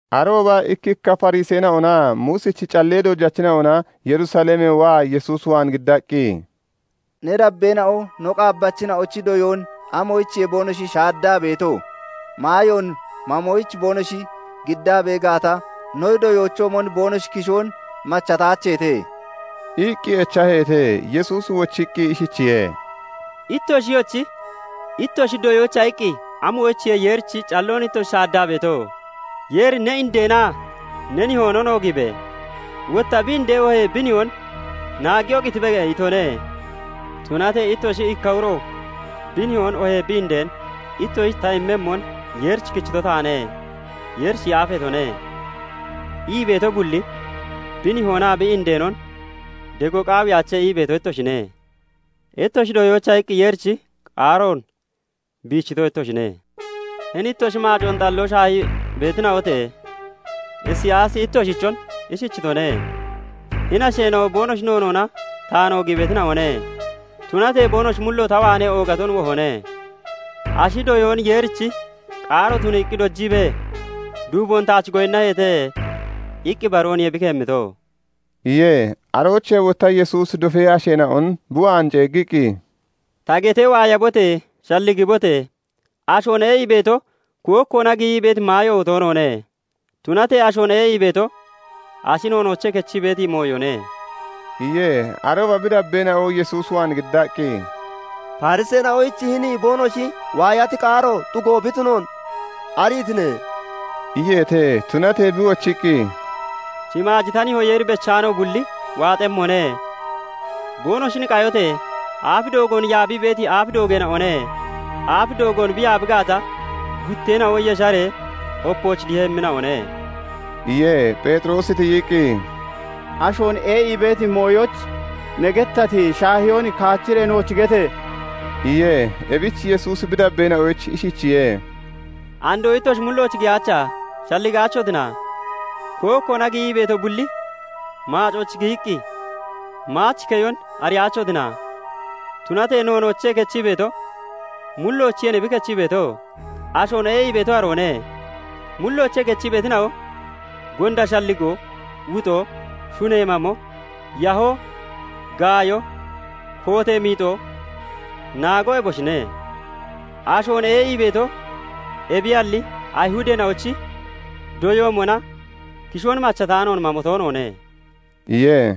Arooba ikkikka Fariseena'onaa Muusichi callee dojachina'ona Yerusalemee waa Yesuus waan giddaqqi, "Ne dabbeena'o no qaabbachina'ochi doyoon amoyichiye boonoshi shaaddaa beeto? Maayoon mamoyich boonoshi giddaa bee gaata, no doyoochoomon boonoshi kishoon machataacheete" iqqi echaheete. Yesuusi wochiqqi ishichiye:- "Ittoshiyochi ittoshi doyoocha iqqi amoyichiye Yeerichi calloon ittoshi shaaddaa beeto? Yeeri 'Ne indeenaa ne nihoonon oogiibe!' wotta 'Bi indeen oohee bi nihoon naaggiyoo qitibe' itone. Tunatee ittoshi 'Ikka uro bi nihoon oohee bi indeen "Ittoshich ta immemmon Yeerich kichito taane; Yeerich yaafeetone" ii beeto bulli, bi nihoonaa bi indeenon dego qaawiyaache' ii beeto ittoshine. Ittoshi doyoocha iqqi Yeerichi qaaroon biichito ittoshine. Hini ittoshi maacoon xalloo shaahii beetina'ote! Isiyaasi ittoshichon ishichitone; 'Hini asheena'o boonoshi noonoona taan oogii beetina'one; tunatee boonoshi mullo ta waanee oogaton wohone; ashi doyoon Yeerichi qaaro tuniiqqi dojiibee, duuboon taach goyinnaheete' iqqi ibarooniye bi keemito" iye. Aroochee wotta Yesuusi dofee asheena'on bi waan ceeggiqqi, "Ta getee waayabote! Shalligibote! Ashoon ee'ii beeto kookkoona giyii beeti maayo toonoone; tunatee ashoon ee'ii beeto ashi noonoochee kechii beeti mooyone" iye. Arooba bi dabbeena'o Yesuus waan giddaqqi, "Fariseena'oyich hini boonoshi waayati qaaro xugo bi tunoon ariitine?" iyeete. Tunatee bi wochiqqi, "Shimaaji ta nihoo Yeeri bechaano bulli waaxemmone. Boonoshin qayote! Aaf doogoon yaabii beeti aaf doogeena'one; aaf doogo aaf doogoon bi yaabi gaata, gutteena'o yesharee opooch dihemmina'one" iye. Pheexiroosi tiyiqqi, "Ashoon ee'ii beeti mooyoyich ne gettati shaahiyoon kaachiree nooch gete!" iye. Ebich Yesuusi bi dabbeena'oyich ishichiye:- "Andoo ittoshi mullooch giyaacha? Shalligaachotina? Kookkoona giyii beeto bulli maacooch giyiqqi maach keyon ariyaachotina? Tunatee noonoochee kechii beeto, mulloocheenniye bi kechii beeto; ashoon ee'ii beeto aroone. mulloochee kechii beetina'o, gonda shalligoo, wuxoo, shunee mamo, yahoo, gaayo, kootee miixo, naago eboshine. Ashoon ee'ii beeto ebiyalli, Ayihudeena'ochi doyoomona kishoon machataanoon mamo toonoone" iye.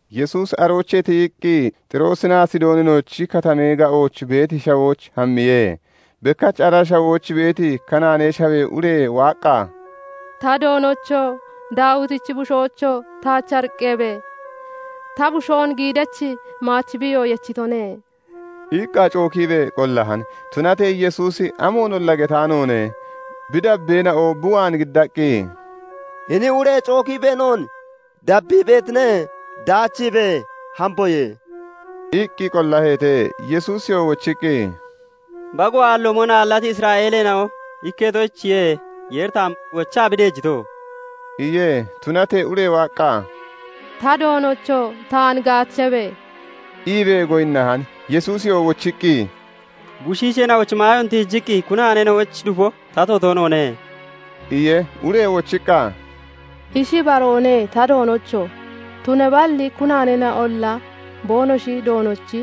Yesuusi aroochee tiyiqqi Xiroosinaa Sidooninochi katamee ga'ooch beeti shawooch hammiye. Bekkach ara shawooch beeti Kanaanee Shawee ure waaqqa, "Ta Doonocho! Daawitichi bushoocho! taach ariqqabe! Ta busheen giidachi maach biiyo yechitone" iqqa cookiibee qollahan. Tunatee Yesuusi amoonolla getaanoone. Bi dabbeena'o bi waan giddaqqi, "Hini ure cookiibee noon dabbii beetine; daachiibe! Hamboye" iqqi qollaheete. Yesuusiyoo wochiqqi, "Bago aalloomon aallati Isra'eeleena'o ikketoyichiye Yeeri taan wochaa bi deejito" iye. Tunatee ure waaqqa, "Ta Doonocho! taan gaachabe!" iibee goyinnahan. Yesuusi wochiqqi, "Bushiisheena'ochi maayoon tiijiqqi kunaaneena'oyich dufo tato toonoone" iye. Ure wochiqqa, "Ishi ibaroone ta Doonocho! Tunaballi kunaaneena'olla boonoshi doonochi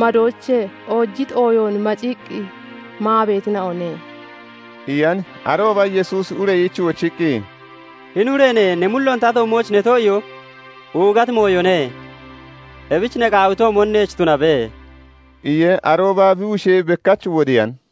madoochee oojiti ooyoon macikkii maa beetina'one" iyan. Arooba Yesuusi ureyich wochiqqi, "Hini ureene! Ne mulloon ta toommooch ne too'iyoo oogati mooyone. Ebich ne qaawitoomon neech tunabe" iye. Arooba bi bushee bekkach wodiyan.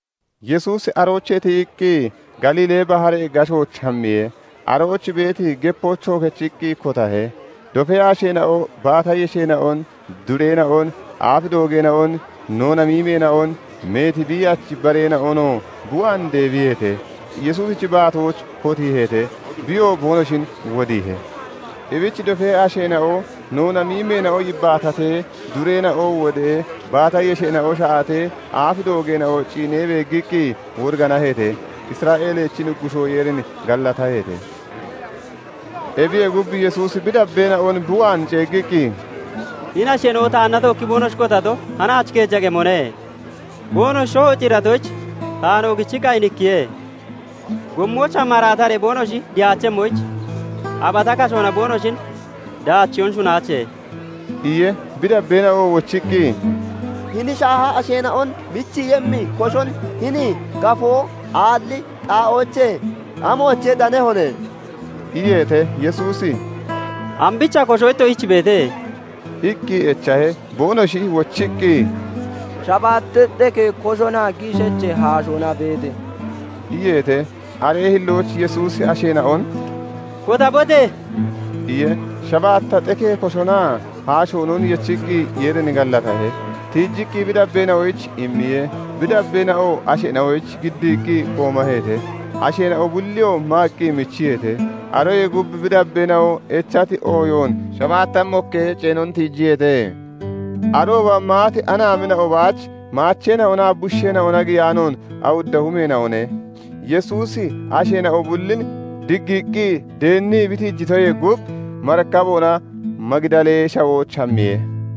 Yesuusi aroochee tiyiqqi Galiilee baharee gashooch hammiye. Arooch beeti gepoochoo kechiqqi kotahe. Dofee asheena'o baata yesheena'on, dureena'on, aaf doogeena'on, noona miimeena'on, meeti biiyachi bareena'onoo bi waan deebiyeete; Yesuusichi baatooch kotiiheete; biyoo boonoshin wodiihe. Ebich dofee asheena'o noona miimeena'o yibbaatatee, dureena'o wodee, baata yesheena'o sha'atee, aaf doogeena'o ciinee beeggiqqi woriganaheete; Isra'eelichi Nuggushoo Yeerin gallataheete. Ebiye gub Yesuusi bi dabbeena'on bi waan ceeggiqqi, "Hini asheena'o taanna tookkii boonoshi kotato, hanaach keeja qemone. Boonoshi shoho ciiratoyich, taan oogichiqqi ayinikkiye. Gommoochaa maraataree boonoshi dihaachemmoyich, abata kashoona boonoshin daachiyoon shunnaache" iye. Bi dabbeena'o wochiqqi, "Hini shaaha asheena'on michiiyemmi koshon hini gafoo aalli xaa'oochee amoochee danehone?" iyeete. Yesuusi "Ambicha kosho ittoshich beete?" iqqi echahe. Boonoshi wochiqqi, "Shabaatta xekee koshonaa giishacha haashoona beete" iyeete. Aree hillooch Yesuusi asheena'on "Kotabote!" iye. Shabaatta xekee koshoonaa haashoonon yechiqqi Yeerin gallatahe. Tiichiqqi bi dabbeena'oyich immiye. Bi dabbeena'oo asheena'oyich giddiiqqi qoomaheete. Asheena'o bulliyoo maaqqi michiyeete. Aroyee gub bi dabbeena'o echati ooyoon shabaatta mokkee ceenon tiijiyeete. Arooba maati anaamina'o baach maacheena'onaa bushiisheena'ona giyaanoon awudda humeena'one. Yesuusi asheena'o bullin diggiiqqi deennii bi daachiitoyee gub, marikaboona Magidalee Shawooch hammiye.